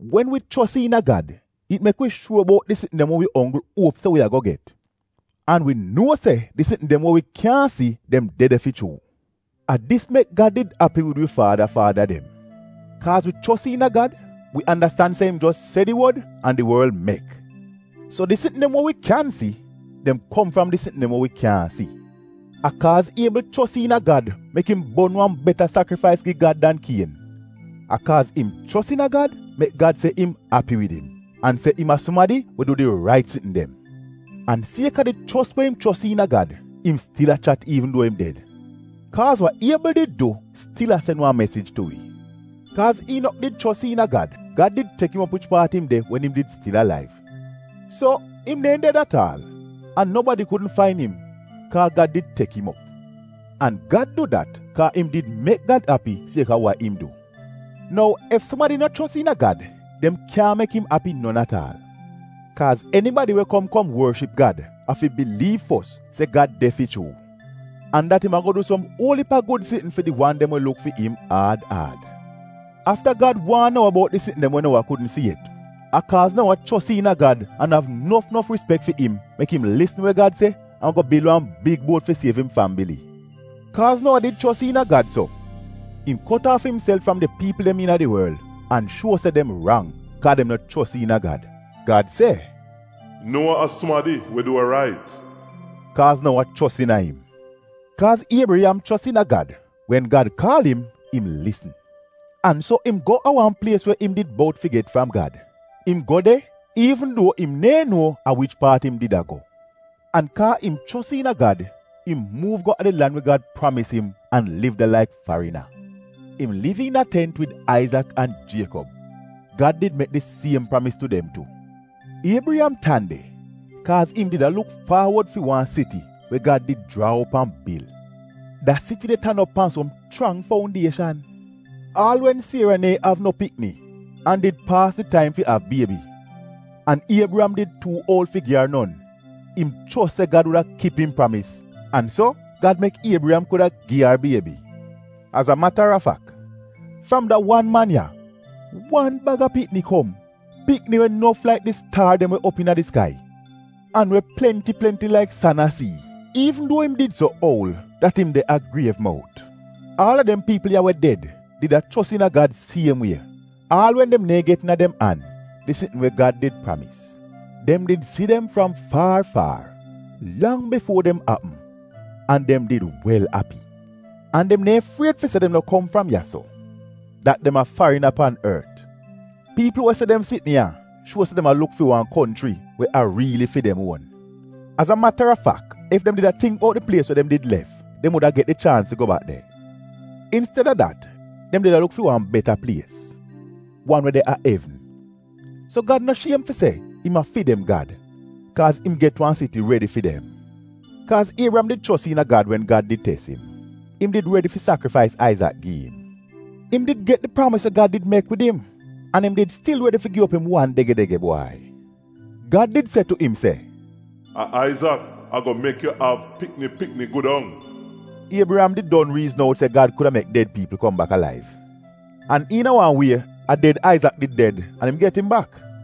Wen wi chos iina Gad it mek wi shuor bout di sitn dem we wi onggl uop se wi ago get, an wi nuo se di sitn dem we wi kyaahn si, dem de de fi chuu. A dis mek Gad did api wid wi faada faada dem. Kaaz wi chos iina Gad, wi andastan se im jos se di wod an di worl mek, so di sitn dem we wi kyan si, dem kom fram di sitn dem we wi kyaahn si. A kaaz Iebl chos iina Gad mek im bon wan beta sakrifais gi Gad dan Kien. A kaaz im chos iina Gad mek Gad se im api wid im, an se im a sumadi we du di rait sitn dem. An sieka di chos we im chos iina Gad, im stil a chat iivn duo im ded, kaaz wa Iebl did du stil a sen wan mesij tu wi. Kaaz Iinok did chos iina Gad, Gad did tek im op wich paat im de wen im did stil alaiv, so im neehn ded at aal, an nobadi kudn fain im kaa Gad did tek im op. An Gad du dat kaa im did mek Gad api sieka wa im du. Nou ef sumadi no chos iina Gad, dem kyaahn mek im api non at aal. Kaaz enibadi we a kom kom worship Gad afi biliiv fos se Gad de fi chuu, an dat im ago du som uol iip a gud sitn fi di wan dem we luk fi im aad aad. Afta Gad waan Nowa bout di sitn dem we Nowa kudn si yet, a kaaz Nowa chos iina Gad an av nof nof rispek fi im mek im lisn we Gad se an go bil wan big buot fi siev im fambili. Kaaz Nowa did chos iina Gad so, im kot aaf imself fram di piipl dem iina di worl an shuo se dem rang kaa dem no chos iina Gad. Gad se, “Nowa a sumadi we du wa rait” kaaz Nowa chos iina im. Kaaz Iebriyam chos iina Gad, wen Gad kaal im, im lisn. An so im go a wan plies we im did bout fi get fram Gad, im go de iivn duo im neehn nuo a wich paat im did a go. An kaa im chos iina Gad im muuv go a di lan we Gad pramis im an liv de laik farina. Im liv iina tent wid Aizak an Jiekob. Gad did mek di siem pramis tu dem tu. Iebriyam tan de kaaz im did a luk faawod fi wan siti we Gad did jraa op an bil. Da siti de tan op pan som chrang foundieshan. Aal wen Siera neehn av no pikni, an did paas di taim fi av biebi, an Iebriyam did tuu uol fi gi ar non, im chos se Gad wuda kip im pramis an so Gad mek Iebriyam kuda gi ar biebi. Az a matarafak, fram da wan man ya, wan bag a pikni kom; pikni we nof laik di staar dem we de op iina di skai, an we plenti plenti laik san a sii, iivn duo im did so oul dat im de a griev mout. Aal a dem piipl ya we ded did a chos iina Gad siem wie, aal wen dem neehn get iina dem an, di sitn we Gad did pramis. (Dem did si dem fram faar faar — lang bifuo dem apm an dem did wel api). An dem neehn fried fi se dem no kom fram ya-so — dat dem a farina pan ort. Piipl we se dem sitn ya, shuo se dem a luk fi wan konchri we a riili fi dem uon. Az a matarafak ef dem did a tingk bout di plies we dem did lef dem wuda get di chaans fi go bak de. Insteda dat dem did a luk fi wan beta plies — wan we de a evn. So Gad no shiem fi se im a fi dem Gad, kaaz im get wan siti redi fi dem. Kaaz Iebriyam did chos iina Gad wen Gad did tes im, im did redi fi sakrifais Aizak gi im. Im did get di pramis we Gad did mek wid im, an im did stil redi fi gi op im wan dege-dege bwai. Gad did se tu im se, “A Aizak ago mek yu av pikni pikni gu dong.” Iebriyam did don riizn out se, Gad kuda mek ded piipl kom bak alaiv, an iina wan wie a ded Aizak did ded an im get im bak.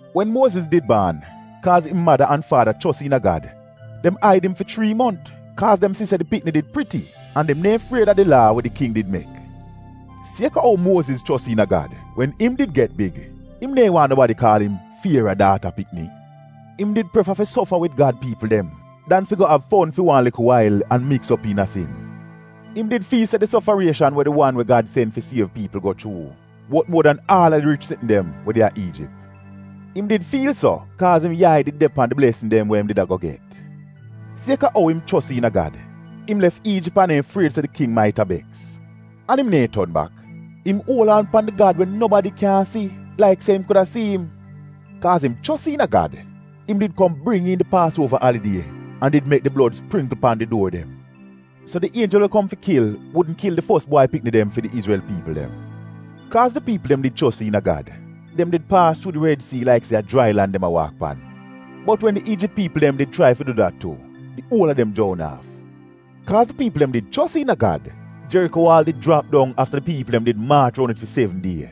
Wen Muoziz did baan, kaaz im mada an faada chos iina Gad, dem aid im fi chrii mont kaaz dem si se di pikni did priti, an dem neehn fried a di laa we di king did mek. Sieka ou Muoziz chos iina Gad wen im did get big, im neehn waahn nobadi kaal im Fiera daata pikni. Im did prefa fi sofa wid Gad piipl dem, dan fi go av fon fi wan likl wail an miks op iina sin. Im did fiil se di sofarieshan we di wan we Gad sen fi siev piipl go chuu, wot muo dan aal a di rich sitn dem we de a Iijip. Im did fiil so, kaaz im yai did de pan di blesn dem we im did ago get. Sieka ou im chos iina Gad, im lef Iijip an neehn fried se di king maita beks. An im neehn ton bak. Im uol aan pan di Gad we nobadi kyaahn si, laik se im kuda si im. Kaaz im chos iina Gad im did kom bring iin di Paasuova alidie an did mek di blod springkl pan di duor dem, so di Ienjel we kom fi kil wudn kil di fos bwai pikni dem fi di izrel piipl dem. Kaaz di piipl dem did chos iina Gad, dem did paas chuu di Red Sii laik se a jrai lan dem a waak pan, bot wen di Iijip piipl dem did chrai fi du dat tu, di uol a dem joun aaf. Kaaz di piipl dem did chos iina Gad, Jeriko waal did jrap dong afta di piipl dem did maach roun it fi sevn die.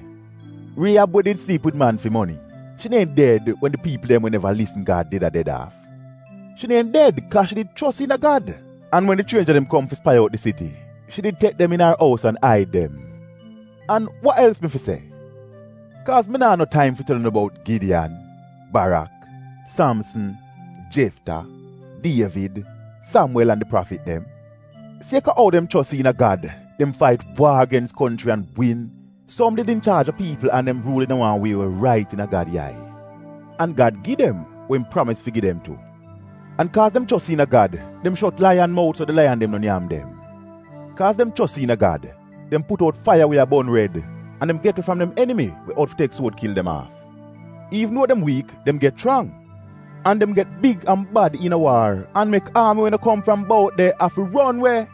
Rieyab we did sliip wid man fi moni, shi neehn ded wen di piipl dem we neva lisn Gad did a ded aaf. Shi neehn ded kaaz shi did chos iina Gad, an wen di chrienja dem kom fi spai out di siti, shi did tek dem iina ar ous an aid dem. An wa els mi fi se? Kaaz mi naa no taim fi tel unu bout Gidiyan, Barak, Samsn, Jefta, Dievid, Samwel an di prafit dem. Sieka ou dem chos iina Gad, dem fait waar gens konchri an win; som did inchaaj a piipl an dem ruul iina wan wie we rait iina Gad yai; an Gad gi dem wa im pramis fi gi dem tu. An kaaz dem chos iina Gad, dem shot laiyan mout so di laiyan dem no nyam dem. Kaaz dem chos iina Gad, dem put out faiya we a bon red; an dem get we fram dem enimi we out fi tek suod kil dem aaf. Iivn duo dem wiik, dem get chrang. An dem get big an bad iina waar an mek aami we no kom fram bout de afi ron we.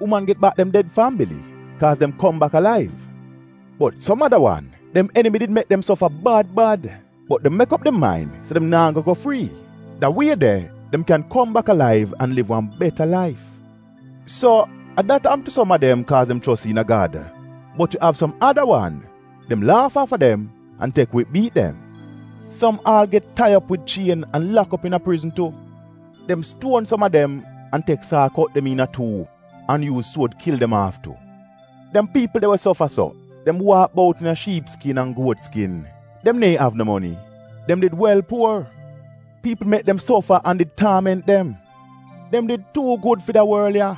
Uman get bak dem ded fambili kaaz dem kom bak alaiv. Bot som ada wan, dem enimi did mek dem sofa bad bad, bot dem mek op dem main se dem naa go go frii. Da wie de, dem kyan kom bak alaiv an liv wan beta laif. So a dat apm tu som a dem kaaz dem chos iina Gad, bot yu av som ada wan — dem laaf aafa dem an tek wip biit dem. Som aal get tai op wid chien an lak op iina prizn tu. Dem stuon som a dem, an tek saa kot dem iina tuu an yuuz suod kil dem aaf tu. Dem piipl de we sofa so, dem waak bout iina shiip skin an guot skin, dem neehn av no moni — dem did wel puor. Piipl mek dem sofa an did taament dem. Dem did tuu gud fi da worl ya!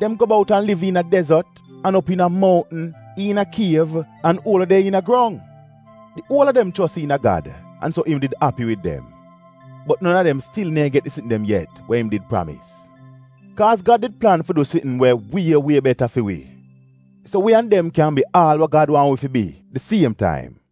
Dem go bout an liv iina dezot an op iina mountn, iina kiev an uol we de iina grong. Di uol a dem chos iina Gad an so im did api wid dem. Bot non a dem stil neehn get di sitn dem yet we im did pramis. Kaaz Gad did plan fi du sitn we wie wie beta fi wi, so wi an dem kyan bi aal a wa Gad waahn wi fi bi siem taim.